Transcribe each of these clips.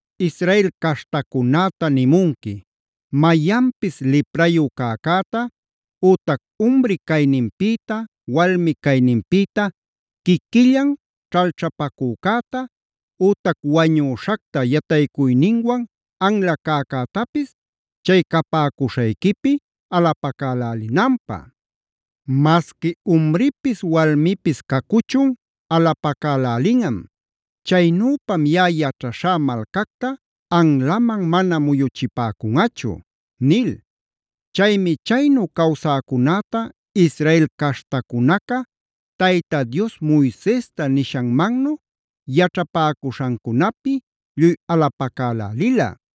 “Israel caśhtacunäta nimunqui: ‘Mayanpis liprayu cäcäta, ütac umri cayninpïta walmi cayninpïta quiquillan ćhalćhapacücäta, ütac wañüśhacta yataycuyninwan anla cäcätapis chay capäcuśhayquipi alapacälälinanpä. Masqui umripis walmipis cacuchun alapacälälinꞌam. Chaynüpam yaꞌa yaćhaśhá malcacta anlaman mana muyuchipäcunꞌachu’” nil. Chaymi chaynu cawsäcunäta Israel caśhtacunaca Tayta Dios Moisesta nishanmannu yaćhapäcuśhancunapi lluy alapacalälila.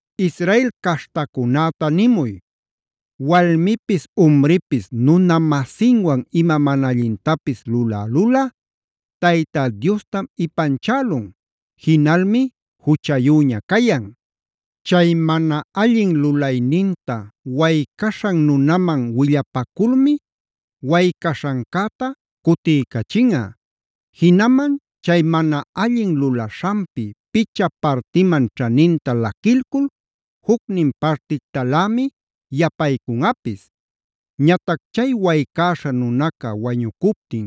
“Israel caśhtacunäta nimuy: ‘Walmipis umripis nuna-masinwan ima mana allintapis lulälulꞌa Tayta Diostam ipanchälun; jinalmi juchayüña cayan. Chay mana allin lulayninta waycaśhan nunaman willapaculmi waycaśhancäta cutiycachinꞌa; jinaman chay mana allin lulaśhanpi picha partiman ćhaninta laquilcul jucnin partictalämi yapaycunꞌapis. Ñatac chay waycäśha nunaca wañucuptin,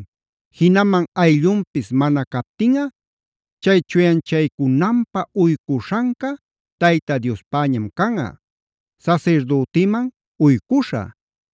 jinaman ayllunpis mana captinꞌa chay chuyanchaycunanpä uycuśhanca Tayta Diospäñam canꞌa, sasirdütiman uycuśhä.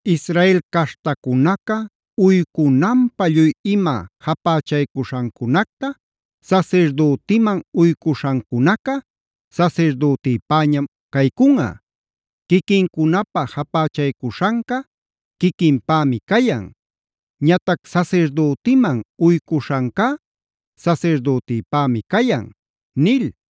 “ ‘Israel caśhtacunaca uycunanpä lluy ima japächaycuśhancunacta sasirdütiman uycuśhancunaca sasirdütipäñam caycunꞌa. Quiquincunapä japächaycuśhanca quiquinpämi cayan; ñatac sasirdütiman uycuśhancá sasirdütipämi cayan’” nil.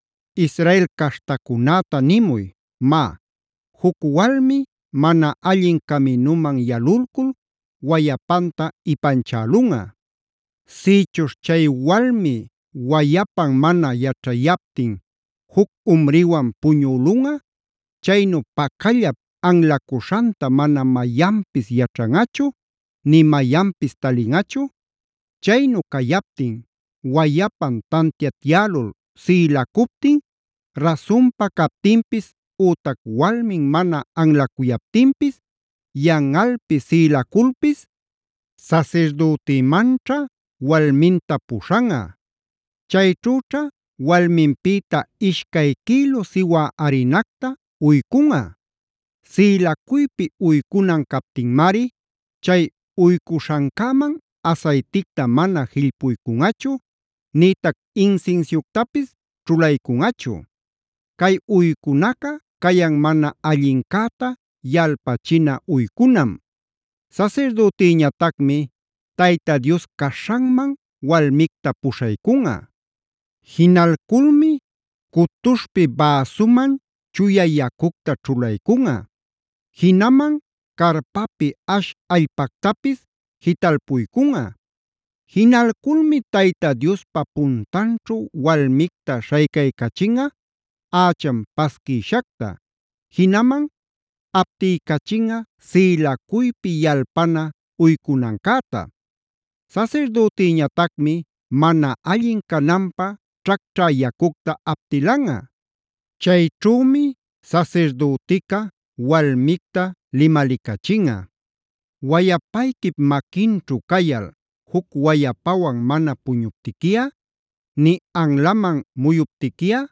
“Israel caśhtacunäta nimuy: ‘Má, juc walmi mana allin caminuman yalulcul wayapanta ipanchälunꞌa. Sïchuśh chay walmi wayapan mana yaćhayaptin juc umriwan puñülunꞌa; chaynu pacallap anlacuśhanta mana mayanpis yaćhanꞌachu, nï mayanpis talinꞌachu. Chaynu cayaptin wayapan tantiatyälul sïlacuptin rasunpa captinpis ütac walmin mana anlacuyaptinpis yanꞌalpi sïlaculpis, sasirdütïmanćha walminta puśhanꞌa. Chayćhüćha walminpïta ishcay quïlu siwä arinacta uycunꞌa. Sïlacuypi uycunan captinmari chay uycuśhancäman asayticta mana jillpuycunꞌachu nïtac insinsiuctapis ćhulaycunꞌachu. Cay uycunaca cayan mana allincäta yalpachina uycunam. “ ‘Sasirdütiñatacmi Tayta Dios caśhanman walmicta puśhaycunꞌa. Jinalculmi cutuśhpi bäsuman chuya yacucta ćhulaycunꞌa. Jinaman carpapi ash allpactapis jitalpuycunꞌa. Jinalculmi Tayta Diospa puntanćhu walmicta śhaycaycachinꞌa ächan pasquïshacta; jinaman aptiycachinꞌa sïlacuypi yalpana uycunancäta. Sasirdütiñatacmi mana allin cananpä ćhacćha yacucta aptilanꞌa. Chayćhümi sasirdütica walmicta limalicachinꞌa: “Wayapayquip maquinćhu cayal juc wayapawan mana puñuptiquiꞌa, nï anlaman muyuptiquiꞌa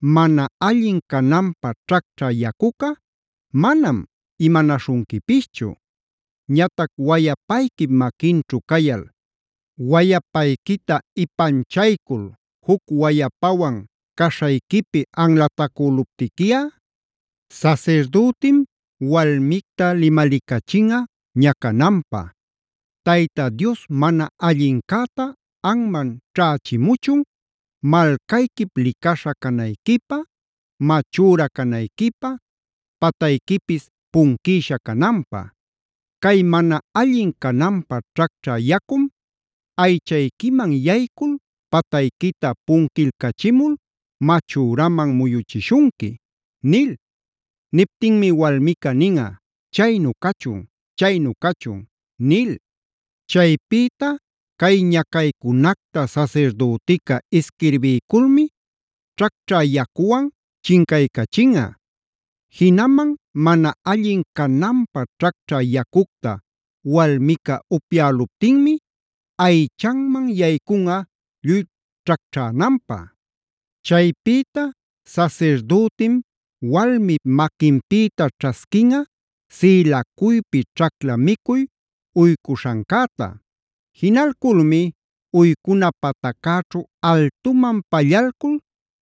mana allin cananpä ćhacćha yacuca manam imanaśhunquipischu. Ñatac wayapayquip maquinćhu cayal wayapayquita ipanchaycul juc wayapawan caśhayquipi anlatacüluptiquiꞌa, (sasirdütim walmicta limalicachinꞌa ñacananpä) Tayta Dios mana allincäta anman ćhächimuchun, malcayquip licaśha canayquipä, machüra canayquipä, patayquipis punquïsha cananpä. Cay mana allin cananpä ćhacćha yacum aychayquiman yaycul patayquita punquilcachimul machüraman muyuchishunqui” nil. Niptinmi walmica ninꞌa: “Chaynu cachun, chaynu cachun” nil. “ ‘Chaypïta cay ñacaycunacta sasirdütica isquirbiyculmi ćhacćha yacuwan chincaycachinꞌa. Jinaman mana allin cananpä ćhacćhä yacucta walmica upyäluptinmi aychanman yaycunꞌa lluy ćhacćhänanpä. “ ‘Chaypïta sasirdütim walmip maquinpïta ćhasquinꞌa sïlacuypi ćhacla micuy uycuśhancäta. Jinalculmi uycuna pataccäćhu altuman pallalcul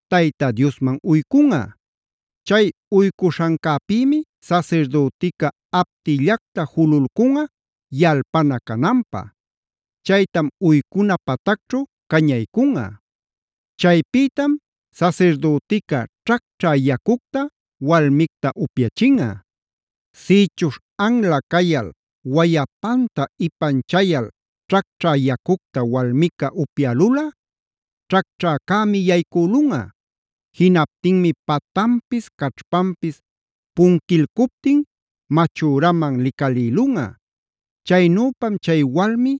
Tayta Diosman uycunꞌa. Chay uycuśhancäpïmi sasirdütica aptillacta jululcunꞌa yalpana cananpä. Chaytam uycuna patacćhu cañaycunꞌa. “ ‘Chaypïtam sasirdütica ćhacćha yacucta walmicta upyachinꞌa. Sïchuśh anla cayal, wayapanta ipanchayal ćhacćhä yacucta walmica upyälulꞌa ćhacćhäcämi yaycülunꞌa. Jinaptinmi patanpis caćhpanpis punquilcuptin machüraman licalïlunꞌa. Chaynüpam chay walmi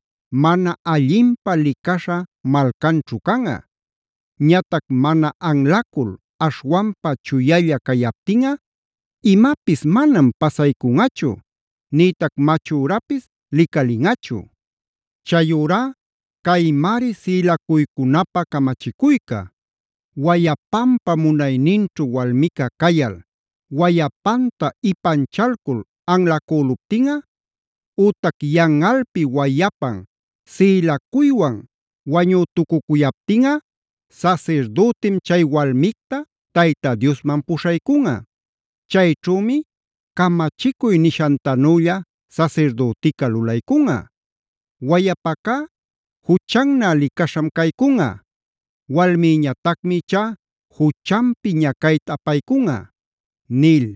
mana allinpä licaśha malcanćhu canꞌa. Ñatac mana anlacul aśhwanpa chuyalla cayaptinꞌa imapis manam pasaycunꞌachu nïtac machürapis licalinꞌachu. “ ‘Chayurá caymari sïlacuycunapä camachicuyca: Wayapanpa munayninćhu walmica cayal wayapanta ipanchalcul anlacüluptinꞌa, ütac yanꞌalpi wayapan sïlacuywan wañütucuyaptinꞌa sasirdütim chay walmicta Tayta Diosman puśhaycunꞌa. Chayćhümi camachicuy nishantanülla sasirdütica lulaycunꞌa. Wayapacá juchannä licaśham caycunꞌa; walmïñatacmi ichá juchanpi ñacayta apaycunꞌa’” nil.